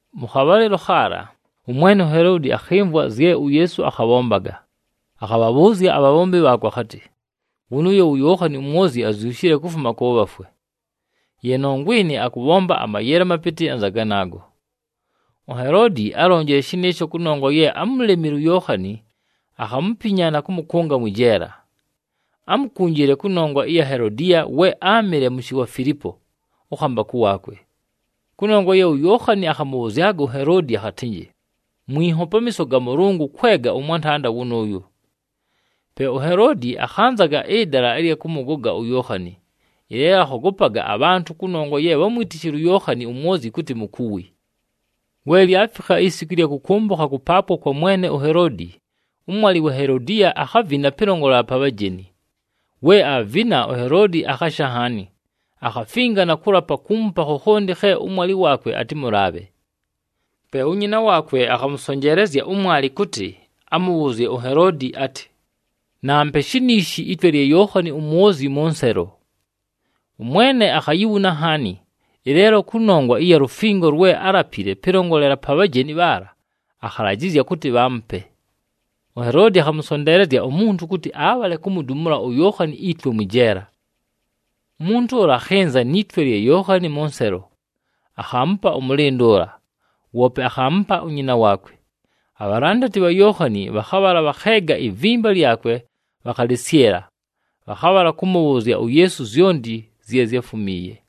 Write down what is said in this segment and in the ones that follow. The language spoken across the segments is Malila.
Mʉ khabhalɨlo khaala ʉmwene uHeloodi akhɨmvwa zye uYeesu akhabhombaga. Akhabhabhʉʉzya abhabhombi bhaakwe akhatɨ, “Wʉnʉʉyo wu Yookhani uMwozyi azyushile kufuma kʉ bhafwe. Ye nongwa ɨnɨ, akʉbhomba amayele amapɨtɨ anza ganaago.” UHeloodi álonjile shɨnɨɨsho kʉnongwa ye ámulemile uYookhani, akhamupinya na kʉmʉkʉnga mwɨ jeela. Ámukunjile kʉnongwa ɨya Helodiya we áamɨle mʉshɨ wa Filipo, ʉkhambakʉ waakwe. Kʉnongwa ye uYookhani akhamʉbhʉzyaga uHeloodi akhatɨnjɨ, “Mwinho pamiiso ga Mʉlʉngʉ kwega ʉmwantanda wʉnʉʉyo.” Pe uHeloodi akhanzaga ɨdala ɨlya kʉmʉgoga uYookhani, ɨleelo akhogopaga abhantʉ kʉnongwa ye bhámwitishile uYookhani uMwozyi kʉtɨ mukuwi. We lyafikha isiku ɨlya kʉkʉmbʉkha kʉpaapwa kwa mwene uHeloodi, ʉmwalɨ wa Helodiya akhavina pɨlongolela pa bhajeni. We aavina, uHeloodi akhasha nhaani. Akhafinga na kʉlapa kuumupa khokhonti khe ʉmwalɨ waakwe atɨmʉlaabhe. Pe unyina waakwe akhamʉsonjeelezya ʉmwalɨ kʉtɨ amʉbhʉʉzye uHeloodi atɨ, “Nampe shiniishi itwe lya Yookhani uMwozyi mʉ nselo.” Ʉmwene akhayibhuna nhaani, ɨleelo kʉnongwa ɨya lufingo lwe álapile pɨlongolela pa bhajeni bhaala, akhalajɨzya kʉtɨ bhaamupe. UHeloodi akhamʉsonteelezya umuntu kʉtɨ abhale kumudumula uYookhani itwe mwɨ jeela. Umuntu ʉla akhɨnza ni twe lya Yookhani mʉ nselo, akhaamupa ʉmʉlɨndʉ ʉla, woope akhaamupa unyina waakwe. Abhalandati bha Yookhani bhakhabhala bhakheega ivimba lyakwe, bhakhalɨsyɨla. Bhakhabhala kʉmʉbhʉʉzya uYeesu zyonti zye zyáfumiiye.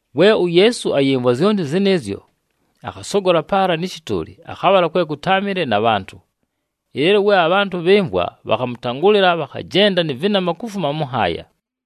We uYeesu ayɨmvwa zyonti zɨnɨɨzyo, akhasogola paala nɨ shɨtʉʉlɨ akhabhala kwe kʉtáamɨle na bhantʉ. Ɨleelo we abhantʉ bhɨmvwa, bhakhamʉtangʉlɨla, bhakhajenda nɨ vɨnama kufuma mʉ nhaaya.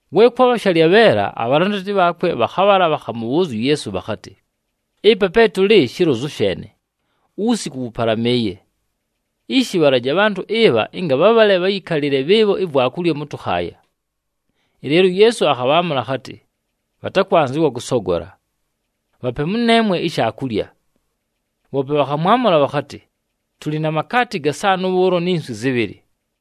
We kwabha shalyabheela, abhalandati bhaakwe bhakhabhala bhakhamʉbhʉʉzya uYeesu bhakhatɨ, “Ɨpa pe tʉlɨ shilozu sheene, uwusiku wʉpalamɨɨye. Ishi, bhalaje abhantʉ ɨbha ɨnga bhabhale bhayɨkalɨle bhɨɨbho ivwakulya mʉ tʉkhaaya.” Ɨleelo uYeesu akhabhaamʉla akhatɨ, “Bhatakwanzɨwa kʉsogola. Bhape mʉneemwe ishaakulya!” Bhoope bhakhamwamʉla bhakhatɨ, “Tʉlɨ na makaati gasaanʉ bhʉʉlo ni nswi zɨbhɨlɨ.”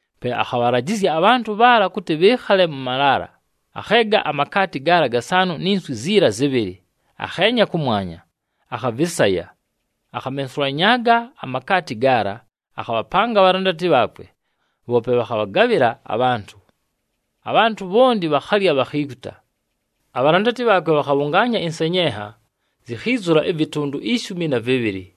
Pe akhabhalajɨzya abhantʉ bhaala kʉtɨ bhɨɨkhale mʉ malaala. Akheega amakaati gaala gasaanʉ ni nswi ziila zɨbhɨlɨ, akheenya kʉmwanya, akhavɨsaya. Akhamensulanyaaga amakaati gaala, akhabhapanga abhalandati bhaakwe, bhoope bhakhabhagabhɨla abhantʉ. Abhantʉ bhonti bhakhalya, bhakhiikuta. Abhalandati bhaakwe bhakhabhʉngaanya ɨnsenyenha, zikhiizula ɨvɨtʉndʉ ishumi na vɨbhɨlɨ.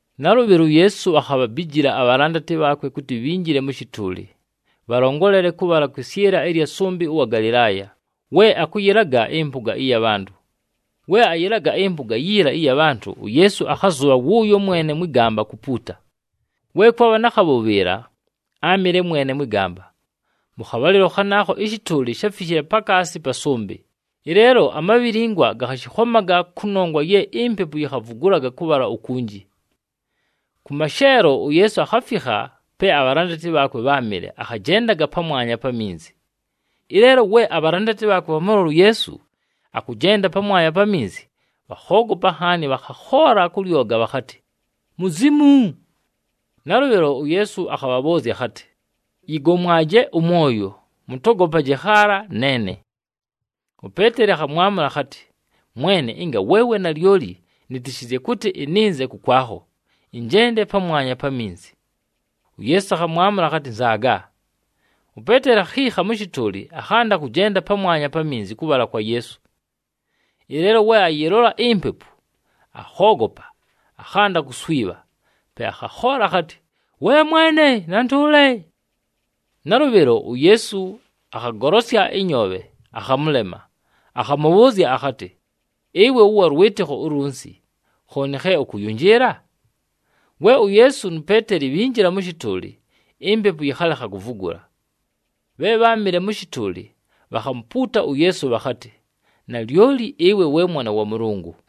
Nalʉbhɨlo, uYeesu akhabhabijila abhalandati bhaakwe kʉtɨ bhinjile mʉ shɨtʉʉlɨ, bhalongolele kʉbhala kwɨsyɨla ɨya sʉmbɨ ʉwa Galɨlaaya we akʉyɨlaga ɨmpʉga ɨya bhantʉ. We ayɨlaga ɨmpʉga yiila ɨya bhantʉ, uYeesu akhazʉbha wʉʉyo mwene mwɨ gamba kupuuta. We kwabha na khabhʉbhɨɨla, áamɨle mwene mwɨ gamba. Mʉ khabhalɨlo khanaakho ɨshɨtʉʉlɨ sháfishile pakaasi pa sʉmbɨ, ɨleelo amabhilingwa gakhashɨkhomaga kʉnongwa ye impepu yikhavugulaga kʉbhala ukunji. Kʉ masheelo, uYeesu akhafikha pe abhalandati bhaakwe bháamɨle akhajendaga pamwanya pa minzi. Ɨleelo we abhalandati bhaakwe bhamʉlola uYeesu akʉjenda pamwanya pa minzi, bhakhoogopa nhaani bhakhakhoola kʉ lyoga bhakhatɨ, “Muzimu!” Nalʉbhɨlo, uYeesu akhabhabhʉʉzya akhatɨ, “Yɨgomwaje ʉmwoyo, mʉtogopaje khaala, neene!” UPeeteli akhamwamʉla akhatɨ, “Mwene, ɨnga weewe nalyoli, nɨtɨshɨzye kʉtɨ ɨnɨnze kʉkwakho, ɨnjende pamwanya pa minzi.” UYeesu akhamwamʉla akhatɨ, “Nzaaga.” UPeeteli akhiikha mʉ shɨtʉʉlɨ, akhanda kʉjenda pamwanya pa minzi kʉbhala kwa Yeesu. Ɨleelo we ayɨlola impepu, akhoogopa, akhanda kuswibha. Pe akhakhoola akhatɨ, “We Mwene, ntʉʉle!” Nalʉbhɨlo, uYeesu akhagolosya ɨnyoobhe, akhamʉlema, akhamʉbhʉʉzya akhatɨ, “Ɨwe wʉwa lwɨtɨkho ulunsi, khooni khe ʉkʉyʉnjɨɨla?” We uYeesu nu Peeteli bhinjila mʉ shɨtʉʉlɨ, impepu yɨkhalekha kuvugula. Bhe bháamɨle mʉ shɨtʉʉlɨ, bhakhamupuuta uYeesu bhakhatɨ, “Nalyoli ɨwe we Mwana wa Mʉlʉngʉ!”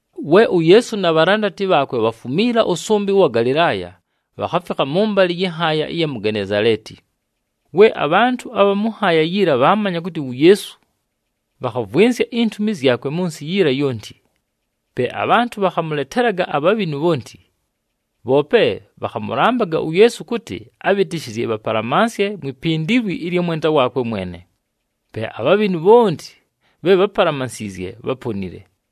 We uYeesu na bhalandati bhaakwe bhafumiila ʉsʉmbɨ ʉwa Galɨlaaya, bhakhafikha mʉmbalɨ yɨ nhaaya ɨya mu Genezaleeti. We abhantʉ abha mʉ nhaaya yiila bhaamanya kʉtɨ wu Yeesu, bhakhavwɨnsya intumi zyakwe mʉ nsɨ yiila yonti. Pe abhantʉ bhakhamʉletelaga abhabhinu bhonti. Bhoope bhakhamʉlambaga uYeesu kʉtɨ abhɨtɨshɨzye bhapalamansye mwi pindilwi ɨlya mwenda waakwe lyene. Pe abhabhinu bhonti bhe bhápalamansiizye, bháponile.